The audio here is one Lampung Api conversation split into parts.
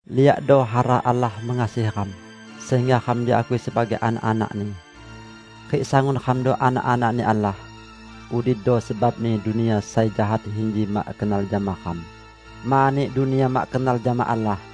Liakdo hara Allah mengasihi ram, sehingga ram diakui sebagai anak-anak-Ni. Rik sangun ramdo anak-anak-Ni Allah. Udido sebabni dunia sai jahat inji mak kenal jama ram, mani dunia mak kenal jama Allah.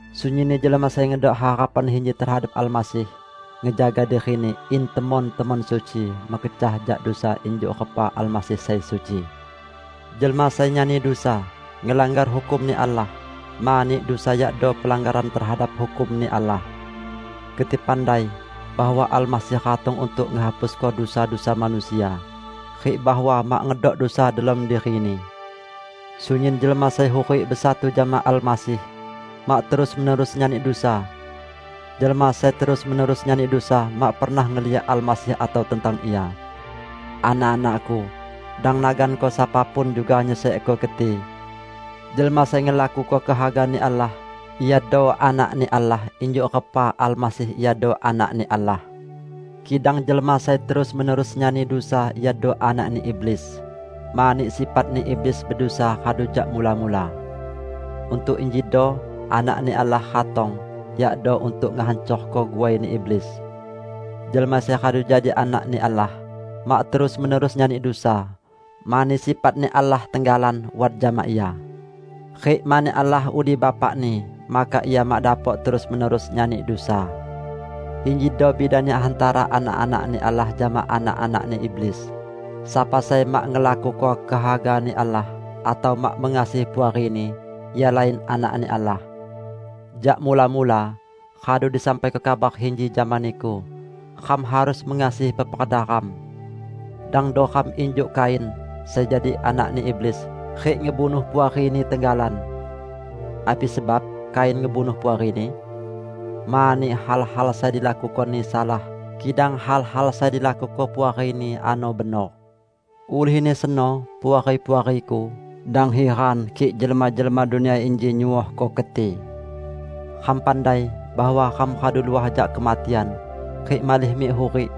Sunyinni jelma sai ngedok harapan inji tehadap Almasih, ngejaga dirini in temon-temon suci, mekecah jak dusa injuk repa Almasih sai suci. Jelma sai nyani dusa, ngelanggar hukum-Ni Allah, mani dusa yakdo pelanggaran tehadap hukum-Ni Allah. Keti pandai bahwa Almasih ratong untuk ngehapusko dusa-dusa manusia, rik bahwa mak ngedok dusa delom diri-Ni. Sunyin jelma sai hurik besatu jama Almasih, mak terus-menerus nyani dusa. Jelma sai terus-menerus nyani dusa, mak pernah ngeliak Almasih atau tentang Ia. Anak-anakku, dang naganko sapa pun juga nyesekko keti. Jelma sai ngelakuko kehaga-Ni Allah iado anak-Ni Allah injuk repa Almasih iado Anak-Ni Allah. Kidang jelma sai terus-menerus nyani dusa iado anakni iblis, mani sifatni iblis bedusa radu jak mula-mula. Untuk injido Anak-Ni Allah ratong, yakdo untuk ngehancorko guaini iblis. Jelma sai radu jadi Anak-Ni Allah, mak terus-menerus nyani dusa, mani sifat-Ni Allah tenggalan wat jama ia. Rik mani Allah udi Bapani, maka ia mak dapok terus-menerus nyani dusa. Injido bidani hantara anak-anak-Ni Allah jama anak-anakni iblis: sapa sai mak ngelakuko kehaga-Ni Allah, atau mak mengasihi puarini, ia lain anak-Ni Allah. Jak mula-mula radu disampaiko kabar inji jama niku: Ram harus mengasihi peperda ram. Dangdo ram injuk Kain, sai jadi anakni iblis rik ngebunuh puarini tenggalan. Api sebab Kain ngebunuh puarini? Mani hal-hal sai dilakukoni salah, kidang hal-hal sai dilakuko puarini ano benor. Ulihni seno, Puari-puariku, dang hiran kik jelma-jelma dunia inji nyuohko keti. Ram pandai bahwa ram radu luah jak kematian, rik malih mik hurik.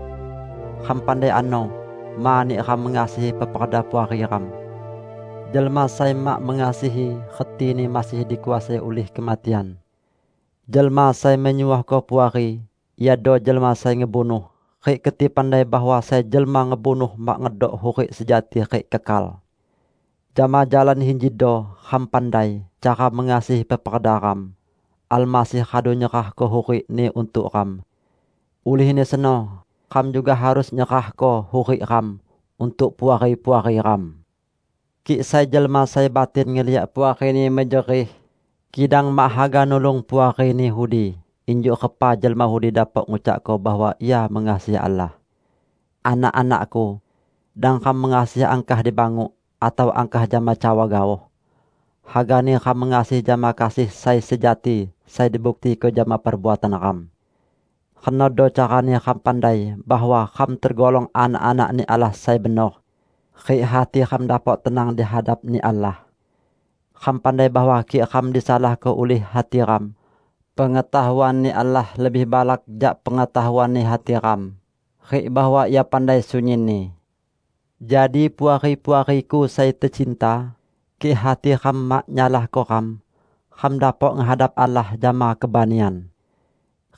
Ram pandai ano, mani ram mengasihi peperda puari ram. Jelma sai mak mengasihi, retini masih dikuasai ulih kematian. Jelma sai menyuohko puari iado jelma sai ngebunuh, rik keti pandai bahwa sai jelma ngebunuh mak ngedok hurik sejati rik kekal. Jama jalan injido ram pandai cara mengasihi peperda ram: Almasih radu nyerahko hurik-Ni untuk ram. Ulihni seno, ram juga harus nyerahko hurik ram untuk puari-puari ram! Kik sai jelma sai batin ngeliak puarini mejerih, kidang mak haga nulung puarini udi, injuk repa jelma udi dapok ngucakko bahwa ia mengasihi Allah? Anak-anakku! Dang ram mengasihi angkah di banguk atau angkah jama cawa gaoh. Hagani ram mengasihi jama kasih sai sejati, sai dibuktiko jama perbuatan ram. Renodo carani ram pandai bahwa ram tegolong anak-anak-Ni Allah sai benor, rik hati ram dapok tenang di hadap-Ni Allah. Ram pandai, bahwa kik ram disalahko ulih hati ram, pengetahuan-Ni Allah lebih balak jak pengetahuan hati ram, rik bahwa Ia pandai sunyinni. Jadi Puari-puariku sai tecinta, kik hati ram mak nyalahko ram, ram dapok ngehadap Allah jama kebanian.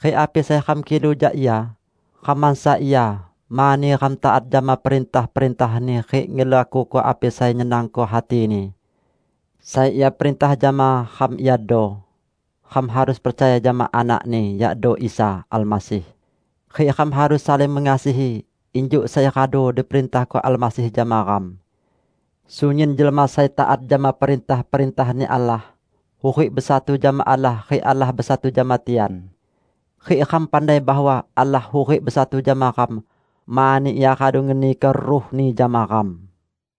Rik api sai ram kilu jak Ia, ram mansa ia, mani ram taat jama perintah-perintah-Ni rik ngelakuko api sai nyenangko hati-Ni. Sai Ia perintah jama ram iado: Ram harus percaya jama Anak-Ni, yakdo Isa Almasih, rik ram harus saling mengasihi, injuk sai radu diperintahko Almasih jama ram. Sunyin jelma sai taat jama perintah-perintah-Ni Allah, hurik besatu jama Allah rik Allah besatu jama tian. Rik ram pandai bahwa Allah hurik besatu jama ram, mani Ia radu ngeniko Ruh-Ni jama ram.